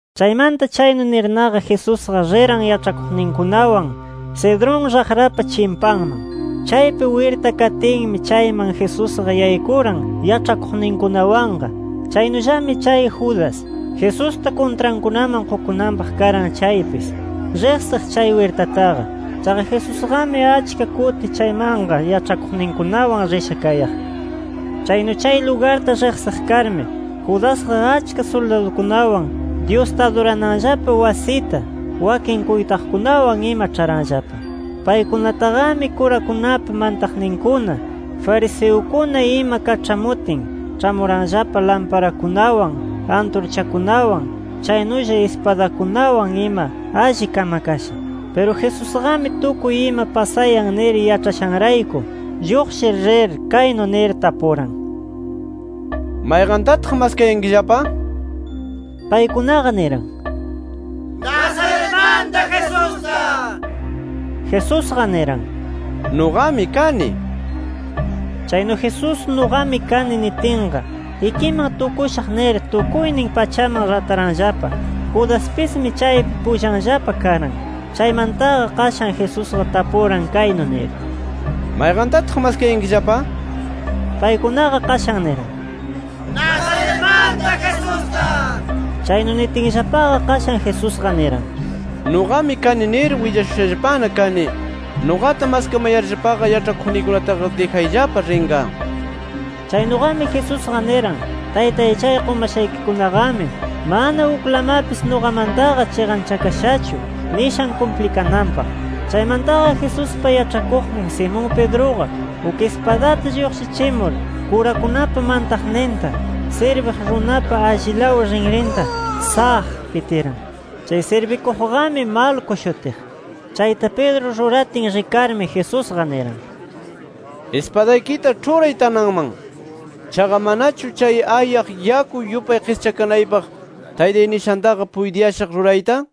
Chaymanta chaynu nirnaqa, Jesusqa riran yaĉhakuqninkunawan Cedrón raqrapa chimpanman. Chaypi wirta katinmi, chayman Jesusqa yaykuran yaĉhakuqninkunawanqa. Chaynullami chay Judas, Jesusta kuntrankunaman qukunanpaq karan chaypis, riqsiq chay wirtataqa. Chaqa Jesusqami achka kuti chaymanqa yaĉhakuqninkunawan risha kayaq. Chaynu chay lugarta riqsiq karmi, Judasqa achka suldadukunawan, Dyusta adurananllapa wasita wakin kuytaqkunawan ima, ĉharanllapa. Paykunataqami kurakunapa mantaqninkuna, fariseukuna ima kaĉhamutin, ĉhamuranllapa lamparakunawan, anturchakunawan, chaynulla ispadakunawan ima alli kamakasha. Piru Jesusqami tukuy ima pasayan nir yaĉhashanrayku, lluqshir rir kaynu nir tapuran: —¿Mayqantataq maskayankillapa? nir. Paykunaqa niran: —Nazaretmanta Jesusta nir. Jesusqa niran: —Nuqami kani. Chaynu Jesús “Nuqami kani” nitinqa, ikiman tukushaq nir tukuynin pachaman rataranllapa. Judaspismi chaypi pullanllapa karan. Chaymantaqa qashan Jesusqa tapuran kaynu nir: —¿Mayqantataq maskayankillapa? nir. Paykunaqa qashan niran: —Nazaretmanta Jesusta nir. Chaynu nitinllapaqa, qashan Jesusqa niran: —Nuqami kani nir willashushallapana kani. Nuqata maskamayarllapaqa, yaĉhakuqniykunataqa dijayllapa rinqa. Chaynuqami Jesusqa niran “Taytay chay qumashaykikunaqami, mana uklamapis nuqamantaqa chiqanchakashachu” nishan kumplikananpaq. Chaymantaqa Jesuspa yaĉhakuqnin Simón Pedruqa, uk ispadata lluqshichimur, kurakunapa mantaqninta sirbiq runapa allilaw rinrinta ¡saq! pitiran. Chay sirbikuqqami Malco shutiq. Chayta Pedro ruratin rikarmi, Jesusqa niran: —Ispadaykita ĉhuray tananman. Chaqa ¿manachu chay ayaq yaku yupay qischakanaypaq Taytay nishantaqa puytiyashaq rurayta? nir.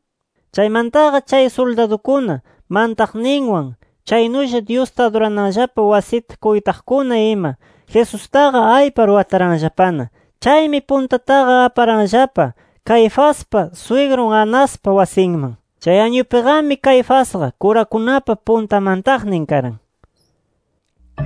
Chaymantaqa chay suldadukuna, mantaqninwan, chaynulla Dyusta adurananllapa wasita kuytaqkuna ima Jesustaqa aypar wataranllapana. Chaymi puntataqa aparanllapa Caifaspa swigrun Anaspa wasinman. Chay añupiqami Caifasqa kurakunapa punta mantaqnin karan.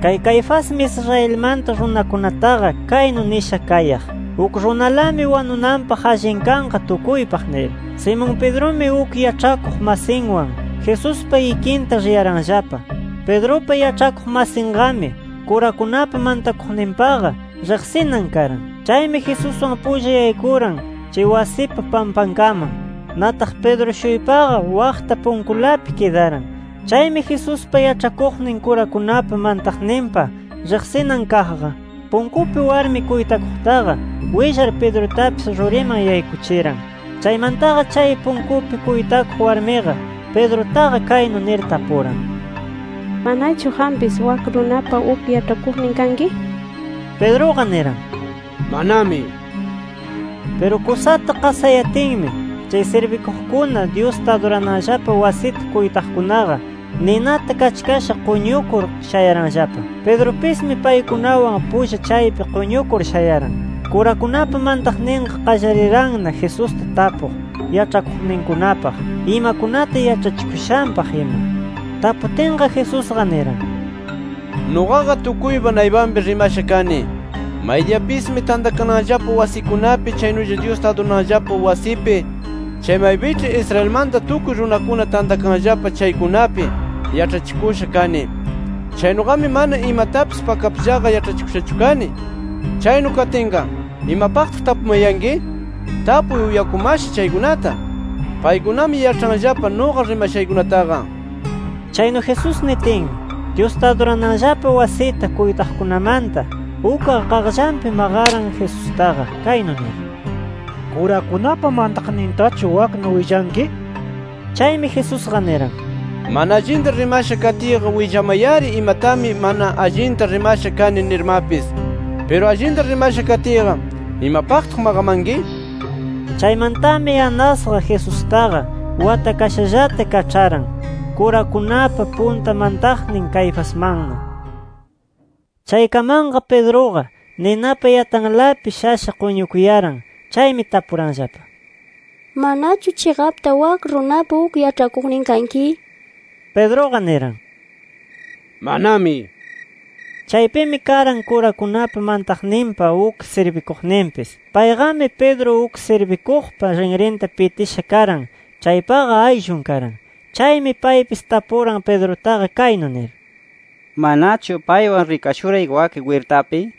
Kay Caifasmi Israelmanta runakunataqa kaynu nisha kayaq: “Uk runalami wanunanpaq allin kanqa tukuypaq” nir. Simón Pedrumi, uk yaĉhakuq masinwan Jesuspa ikinta riyaranllapa. Pedrupa yaĉhakuq masinqami, kurakunapa mantakuqninpaqa riqsinan karan. Chaymi Jesuswan pulla yaykuran chay wasipa pampankaman. Nataq Pedro-shuypaqa waqta punkulapi kidaran. Chaymi Jesuspa yaĉhakuqnin kurakunapa mantaqninpa riqsinan kaqqa, punkupi warmi kuytakuqtaqa willar Pedrutapis ruriman yaykuchiran. Chaymantaqa chay punkupi kuytakuq warmiqa, Pedrutaqa kaynu nir tapuran: —¿Manachu qampis wak runapa uk yaĉhakuqnin kanki? nir. Pedruqa niran: —Manami nir. Piru kusata qasayatinmi, chay sirbikuqkuna, Dyusta adurananllapa wasita kuytakuqkunaqa ninata kachkasha quñukur shayaranllapa. Pedrupismi paykunawan pulla chaypi quñukur shayaran. Kurakunapa mantaqninqa qallariranna Jesusta tapuq yaĉhakuqninkunapaq, imakunata yaĉhachikushanpaq ima. Taputinqa, Jesusqa niran: —Nuqaqa tukuypa naypanpi rimasha kani. Maydiyapismi tantakananllapa wasikunapi, chaynulla Dyusta adurananllapa wasipi, chay maypiĉhi Israelmanta tukuy runakuna tantakanllapa chaykunapi yaĉhachikusha kani. Chaynuqami mana imatapis pakapllaqa yaĉhachikushachu kani. Chaynu katinqa, ¿imapaqtaq tapumayanki? Tapuy uyakumasha chaykunata. Paykunami yaĉhanllapa nuqa rimashaykunataqa nir. Chaynu Jesús nitinmi, Dyusta adurananllapa wasita kuytaqkunamanta ukqa qaqllanpi maqaran Jesustaqa, kaynu nir: —¿Kurakunapa mantaqnintachu waknu willanki? nir. Chaymi Jesusqa niran: —Mana allinta rimasha katiyqa willamay-ari imatami mana allinta rimasha kani nirmapis. Piru allinta rimasha katiyqa ¿imapaqtaq maqamanki? nir. Chaymantami Anasqa Jesustaqa watakashallata kaĉharan, kurakunapa punta mantaqnin Caifasmanna. Chaykamanqa, Pedruqa ninapa yatalanpi shasha quñukuyaran. Chaymi tapuranllapa: —¿Manachu chiqapta wak runapa uk yaĉhakuqnin kanki? nir. Pedruqa niran: —Manami nir. Chaypimi karan kurakunapa mantaqninpa uk sirbikuqninpis. Payqami, Pedro uk sirbikuqpa rinrinta pitisha karan chaypaqa ayllun karan. Chaymi paypis tapuran Pedrutaqa kaynu nir: —¿Manachu paywan rikashuray wak wirtapi?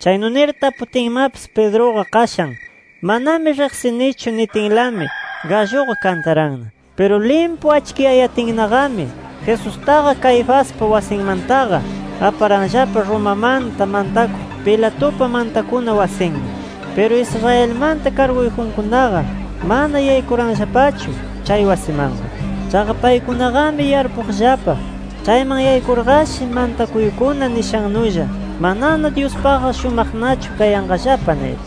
Chaynu nir taputinmapis, Pedruqa qashan, “Manami riqsinichu” nitinlami galluqa kantaranna. Piru limpu achkiyayatinnaqami, Jesustaqa Caifaspa wasinmantaqa, aparanllapa Romamanta mantakuq Pilatupa mantakuna wasinman. Piru Israelmanta karguyjunkunaqa mana yaykuranllapachu chay wasimanqa. Chaqa paykunaqami yarpuqllapa: Chayman yaykurqashi mantakuykuna nishannulla manana Dyuspaqqa shumaqnachu kayanqallapa nir.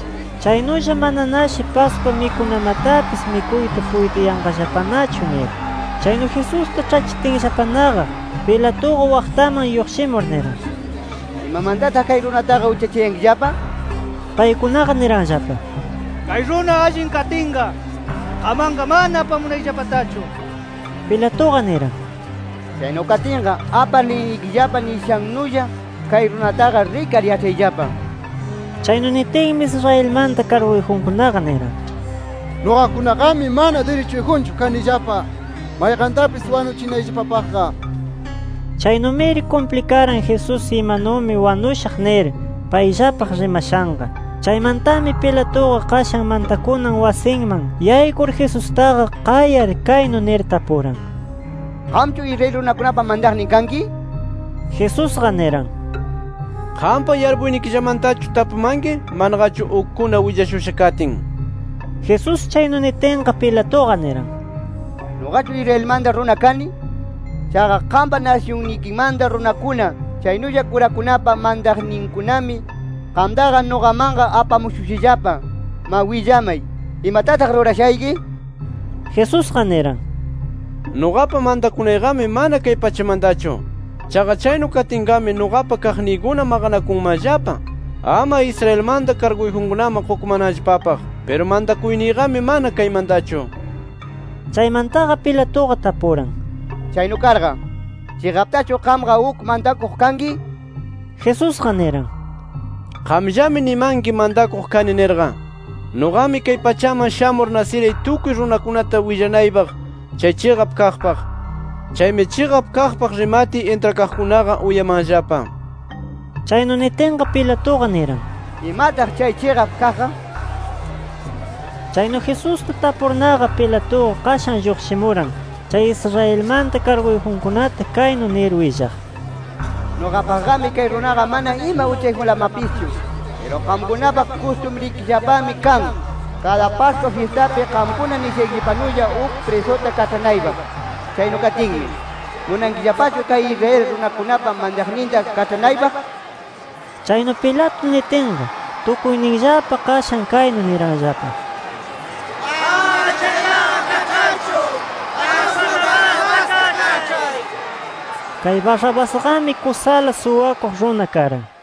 Chaynulla mananashi Pascua mikunamatapis mikuyta puytiyanqallapanachu nir. Chaynu Jesusta ĉhachitinllapanaqa, Pilatuqa waqtaman lluqshimur niran: —¿Imamantataq kay runataqa uchachayankillapa? nir. Paykunaqa niranllapa: —Kay runa allin katinqa, qammanqa mana apamunayllapatachu nir. Pilatuqa niran: —Chaynu katinqa, apar liynikillapa nishannulla kay runataqa rikar yaĉhayllapa nir. Chaynu nitinmi, Israelmanta karguyjunkunaqa niran: —Nuqakunaqami mana dirichuyjunchu kanillapa mayqantapis wanuchinayllapapaqqa nir. Chaynumiri kumplikaran, Jesús imanumi wanushaq nir payllapaq rimashanqa. Chaymantami Pilatuqa qashan mantakunan wasinman yaykur, Jesustaqa qayar kaynu nir tapuran: —¿Qamchu Israel runakunapa mantaqnin kanki? nir. Jesusqa niran: —¿Qampa yarpuynikillamantachu tapumanki, manaqachu ukkuna willashusha katin? nir. Jesús chaynu nitinqa, Pilatuqa niran: —¿Nuqachu Israelmanta runa kani? Chaqa qampa nasyunnikimanta runakuna, chaynulla kurakunapa mantaqninkunami qamtaqa nuqamanqa apamushushallapa. Ma willamay, ¿imatataq rurashayki? nir. Jesusqa niran: —Nuqapa mantakunayqami mana kay pachamantachu. Chaqa chaynu katinqami, nuqapa kaqniykuna maqanakunmanllapa ama Israelmanta karguyjunkunaman qukumananllapapaq. Piru mantakuyniyqami mana kaymantachu nir. Chaymantaqa Pilatuqa tapuran: —Chaynu karqa, ¿chiqaptachu qamqa uk mantakuq kanki? nir. Jesusqa niran: —Qamllami nimanki, mantakuq kani nirqa. Nuqami kay pachaman shamur nasiray tukuy runakunata willanaypaq chay chiqap kaqpaq. Chaymi chiqap kaqpaq rimatiy intrakaqkunaqa, uyamanllapa nir. Chaynu nitinqa, Pilatuqa niran: —¿Imataq chay chiqap kaqqa? nir. Chaynu Jesusta tapurnaqa, Pilatuqa qashan lluqshimuran, chay Israelmanta karguyjunkunata kaynu nir willaq: —Nuqapaqqami kay runaqa mana ima uchayjunlamapischu. Piru qamkunapa kustumrikillapami kan, kada Pascua fyistapi qamkuna nishaykillapanulla uk prisuta kaĉhanaypaq. Chaynu katinmi, ¿munankillapachu kay Israel runakunapa mantaqninta kaĉhanaypaq? nir. Chaynu Pilato nitinqa, tukuyninllapa qashan kaynu niranllapa: —¡Ama chaytaqa kaĉharchu, ashwan Barrabasta kaĉhay! nir. Kay Barrabasqami kusala suwakuq runa karan.